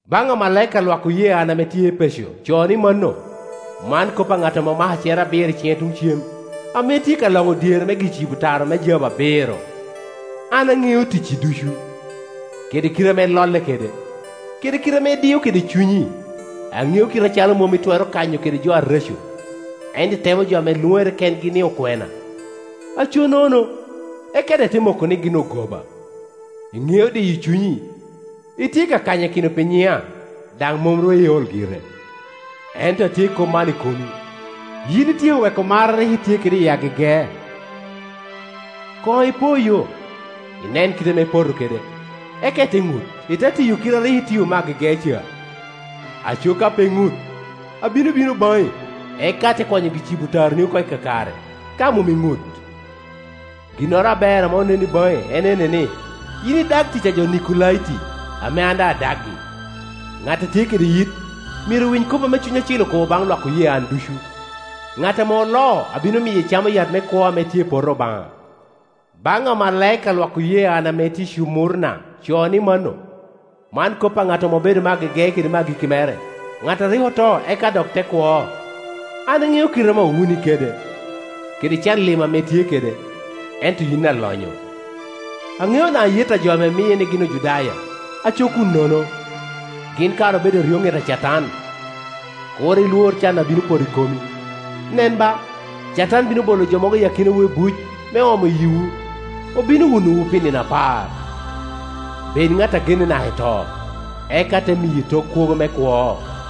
“Baŋ amalaika a lwak oye an ame tye i Epeco co ni mano: “Man kop a ŋat ame omako acer abiro i ciŋe tuŋ cem, ame tye ka loŋo dyere me gi-cibo tara me jabu abiro. “‘An aŋeo ticci ducu, kede kite ame ilolle kede, kede kite ame idio kede cunyi. Aŋeo kite acalo mom itwero kanyo kede jo areco, ento itemo jo ame lwoŋere kengi ni okwena, aco nono, eka daŋ ite moko ni gin ogoba. Iŋeo diyo cunyi, itye ka kanyakino pi nyiŋa, daŋ mom ru iol gire. Ento atye i kop man i komi, yin ityeko weko mar a rik itye kede i agege. Koŋ ipoyo, inen kit ame ipoto kede, eka ite ŋut, ite tiyo kit a rik itio me agege ca. Aco ka pe iŋut, abino bino baŋi, eka ate kwanyo gi-cibo tarani oko i kakare, ka mom iŋut. Ginnoro aber ame onen baŋi en ene ni, yin idag tic a jo Nikolaiti ame an daŋ adagi. Ŋat a tye kede yit, myero owiny kop ame Cuny Acil okobo baŋ lwak oye an ducu. Ŋat ame oloo abino miye camo yat me kwo ame tye i Poto Obaŋa.’ “Baŋ amalaika a lwak oye an ame tye i Cumurna co ni mano: “Man kop a ŋat ame obedo me agege kede me agikki mere, ŋat a rik oto eka dok te kwo. “‘An aŋeo kite ame owuni kede, kede can lim ame itye kede (ento yin alonyo). Aŋeo daŋ ayet a jo ame miye ni gin Ojudaya, aco kun nono; gin kara obedo eryoŋet a Catan. Kur ilwor can a bino poto i komi. Nen ba, Catan bino bolo jo mogo i akinawu i buc me om yiwu. Obino wunowu pi nino apar. Bed ŋat a genne naka i to, eka ate miyi tok kwogo me kwo.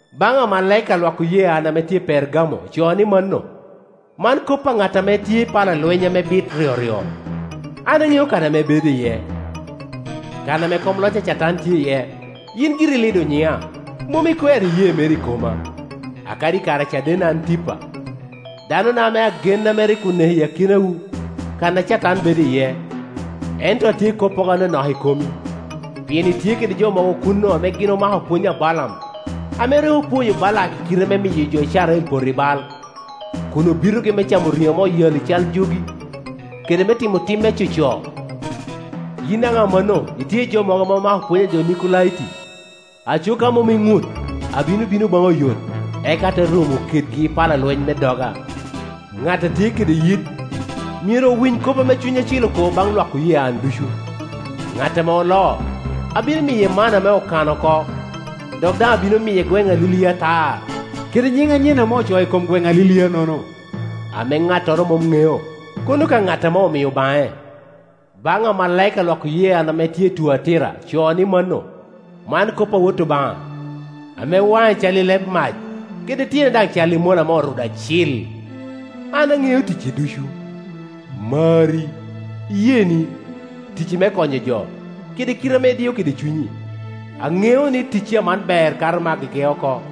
“Baŋ amalaika a lwak oye an ame tye i Pergamo co ni mano: “Man kop a ŋat ame tye i pala lweny ame bit ryoryo. “‘An aŋeo kan ame ibedo iye, kan ame kom loc a Catan tye iye. Yin giri ilido nyiŋa, mom ikwero iyee meri i koma, akadi i kare a cadenna Antipa, daŋ ona ame agen ame rik oneko i akinowu, kan a Catan bedo iye. Ento atye i koppogo anonok i komi, pien itye kede jo mogo kuno ame gin omako pwony a Balaam, ame rik opwonyo Balak kite me miyo jo Icrael poto i bal, kun obitogi me camo riŋo ame oyalli cal jogi, kede me timo tim me coco. Yin daŋ amanno itye i jo mogo ame omako pwony a jo Nikolaiti. Aco ka mom iŋut, abino bino baŋi oyot, eka ate romo kedgi i pala lweny me doga. Ŋat a tye kede yit, myero owiny kop ame Cuny Acil okobo baŋ lwak oye an ducu, Ŋat ame oloo, abino miye manna ame okano oko, dok daŋ abino miye gweŋ alilia atar, kede nyiŋ anyen ame ocoo i kom gweŋ alilianono, ame ŋattoro mom ŋeo, kono ka ŋat ame omio baŋe.’ “Baŋ amalaika a lwak oye an ame tye i Tuatira co ni mano: “Man kop a Wot Obaŋa, ame waŋe cal i leb mac, kede tyene daŋ cal i mola ame orudo acil. “‘An aŋeo ticci ducu, marri, iyeeni, ticci me konyo jo, kede kite ame idio kede cunyi. Aŋeo ni ticci aman ber kato me agege oko.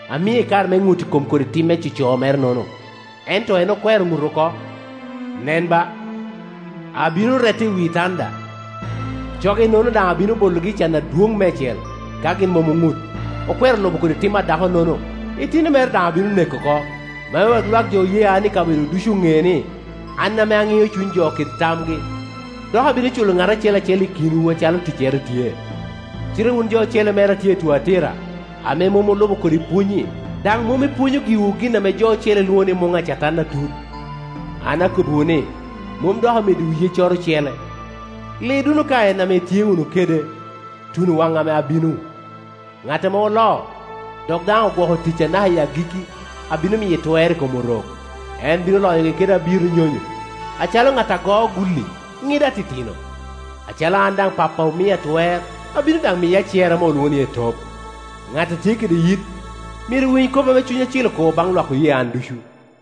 Amie kare me ŋut i kom kodi tim me coco mere-nono, ento en okwero ŋut oko. Nen ba, abino rete i wi tanda, coge-nono daŋ abino bologi i can adwoŋ meicel, ka gin mom oŋut, okwero lubo kodi tim a dako-nono. Itino mere daŋ abino neko oko, me wek lwak jo oye an i kabedo ducu oneni, an ame aŋio cuny jo kede tamgi, dok abino culo ŋat acel acel i kinwu acalo ticcere tye. “Cite wun jo ocele mere a tye i Tuatira, ame mom olubo kodi pwonynyi daŋ mom ipwonyo giwu gin ame jo ocele lwoŋo ni ‘muŋ a Catan atut,’ an akobbiwu ni, mom dok ameddiwu yeccoro ocele. Lid wunu ka en ame itye wunu kede, tuno wan ame abino. Ŋat ame oloo, dok daŋ ogwoko ticca naka i agikki, abino miye twer i kom orok. En bino loyogi kede abiro nyonyo, acalo ŋat a goo gulli, ŋido atitino. Acalo an daŋ Pappa omia twer. Abino daŋ miye acer ame olwoŋo ni etop. Ŋat a tye kede yit, myero owiny kop ame Cuny Acil okobo baŋ lwak oye an ducu.